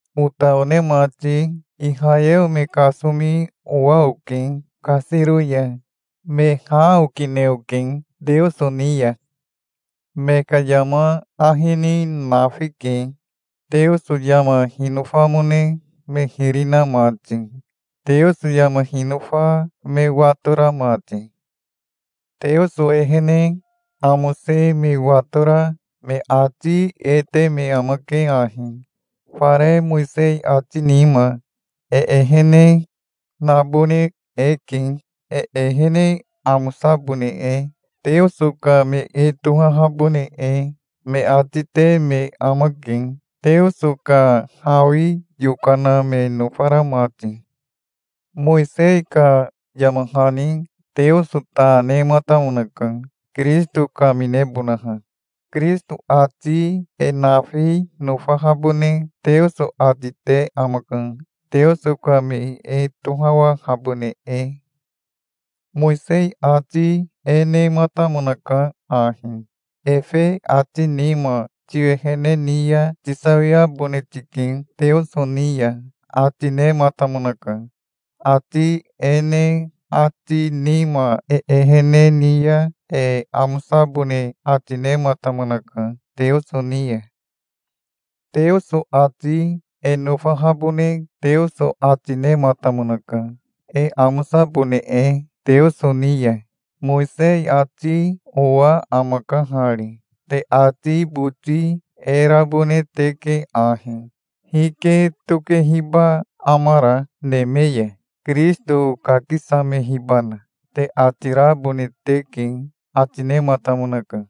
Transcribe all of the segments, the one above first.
Ota one mati, Ihayeo me kasomi owa oke kasiro ya. Me ha okine oke Teoso ni ya. Me ka yama ahi ni nafike, Teoso yama hinofamone me hiri na mati, Teoso yama hinofa me watora mati. Teoso ehene amose me watora me ati e te me amake ahi: "Fare Mowisei ati nima e ehene nabone eke, e ehene amosabone e, Teoso ka me e tohahabone e", me ati te me amake, Teoso ka hawi yokana me nofara mati. Mowisei ka yama hani Teoso ta nematamonaka, Kirisito kaminebonaha. Kirisito ati e nafi nofahabone Teoso ati te amaka, Teoso ka me e tohawahabone e. Mowisei ati e nematamonaka ahi: "Efe ati nima tiwehene ni ya tisawiabone tike Teoso ni ya", ati nematamonaka. Ati e ne ati nima e ehene ni ya e amosabone ati nematamonaka Teoso ni ya. Teoso ati e nofahabone Teoso ati nematamonaka, e amosabone e Teoso ni ya. Mowisei ati owa amaka hari: "Te ati boti e rabone teke ahi: 'Hike tokehiba amara neme ya (Kirisito kakisamehibana)?' te ati rabone teke", ati nematamonaka.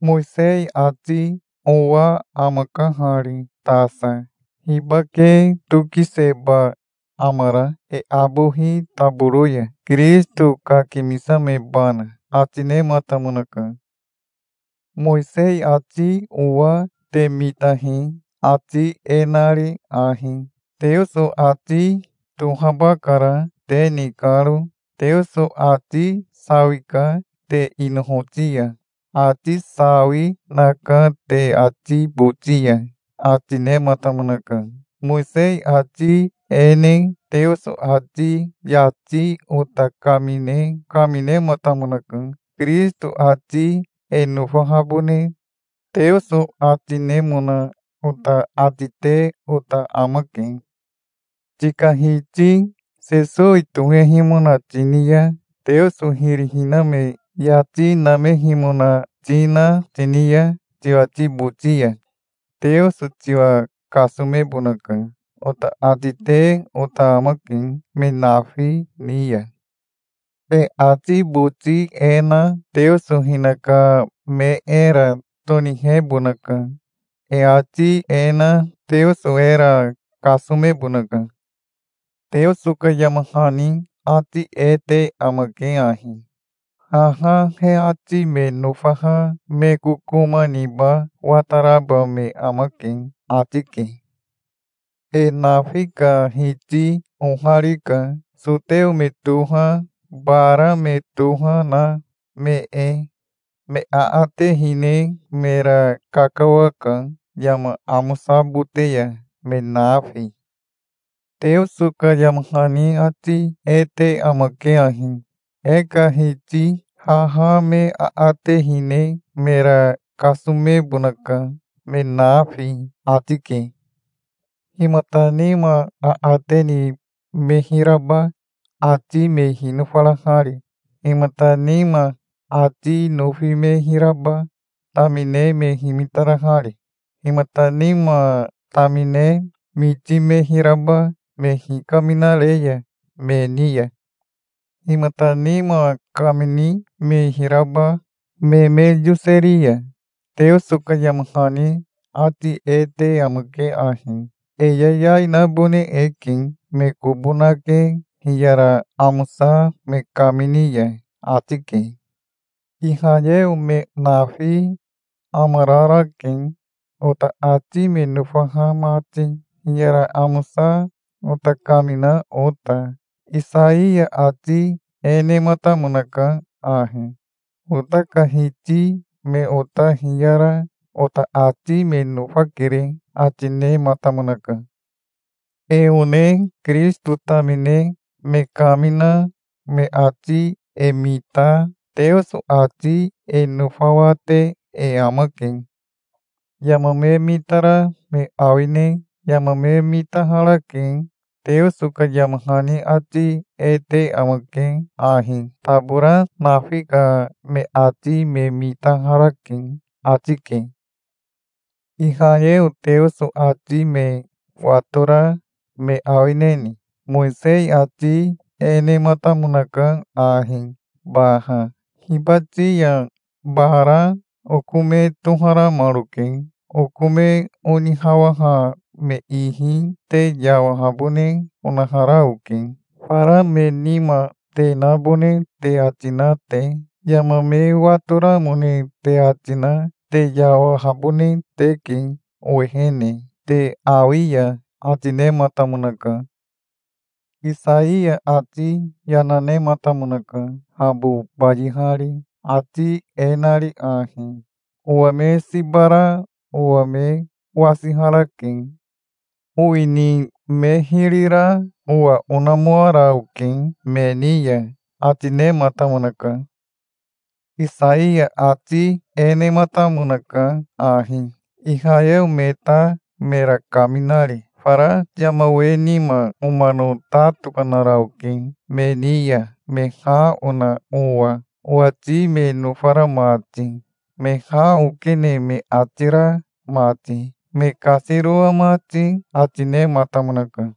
Mowisei ati owa amaka hari tasa: "Hibake tokiseba amara e abohi taboro ya (Kirisito kakimisamebana)?" ati nematamonaka. Mowisei ati owa te mitahi, ati e nari ahi: "Teoso ati tohaba kara te ni karo. Teoso ati sawika te inohoti ya. Ati sawi naka te ati boti ya", ati nematamonaka. Mowisei ati e ne Teoso ati yati ota kamine kaminematamonaka. Kirisito ati e nofahabone Teoso ati nemona ota ati te ota amake. "Tika Hiti Sesowi tohehimona tini ya, Teoso hiri hiname yati namehimona tina tini ya tiwati boti ya, Teoso tiwa kasomebonaka", ota ati te ota amake me nafi ni ya. E ati boti e na Teoso hinaka me era tonihebonaka. E ati e na Teoso era kasomebonaka. Teoso ka yama hani ati e te amake ahi: "Haha he ati me nofaha me kokoma niba wataraba me amake", ati ke. E nafi ka Hiti oharika, soteo me toha, bara me toha, na me e. Me aate hine mera kakawaka yama amosabote ya, me nafi. Teoso ka yama hani ati e te amake ahi: "E ka Hiti haha me aate hine mera kasomebonaka, me nafi", ati ke. Himata nima aate ni me hiraba, ati me hinofarahari? Himata nima ati nofi me hiraba, tamine me himitarahari? Himata nima tamine miti me hiraba, me hikaminare ya me ni ya? Himata nima kamini me hiraba, me me yoseri ya? Teoso ka yama hani ati e te amake ahi: "E yayai nabone e ke, me kobo nake hiyara amosa me kamini ya", ati ke. Ihayeo me nafi amararake, ota ati me nofaha mati, hiyara amosa ota kamina ota. Isaiya ati e nematamonaka ahi: "Ota ka Hiti, me ota hiyara ota ati me nofakere", ati nematamonaka. E one Kirisito tamine me kamina me ati e mita Teoso ati e nofawate e amake. Yama me mitara me awine? Yama me mitaharake. Teoso ka yama hani ati e te amake ahi: "Tabora nafi ka me ati me mitaharake", ati ke. Ihayeo Teoso ati me watora me awineni? Mowisei ati e nematamonaka ahi baha: "Hibati ya bara oko me toharamaroke. Oko me onihawaha me ihi te yawahabone onahara oke, fara me nima te nabone te ati na te. Yama me watoramone te ati na te yawahabone teke owehene te awi ya", ati nematamonaka. Isaiya ati yana nematamonaka, habo bayihari, ati e nari ahi: "Owa me siba ra owa me wasiharake. Owini me hiri ra owa onamoara oke me ni ya", ati nematamonaka. Isaiya ati e nematamonaka ahi, Ihayeo me ta mera kaminari: "Fara yama we nima omano ta tokanara oke me ni ya, me ha ona owa, owati me nofara mati, me ha okene me ati ra mati, me kasiroa mati", ati nematamonaka.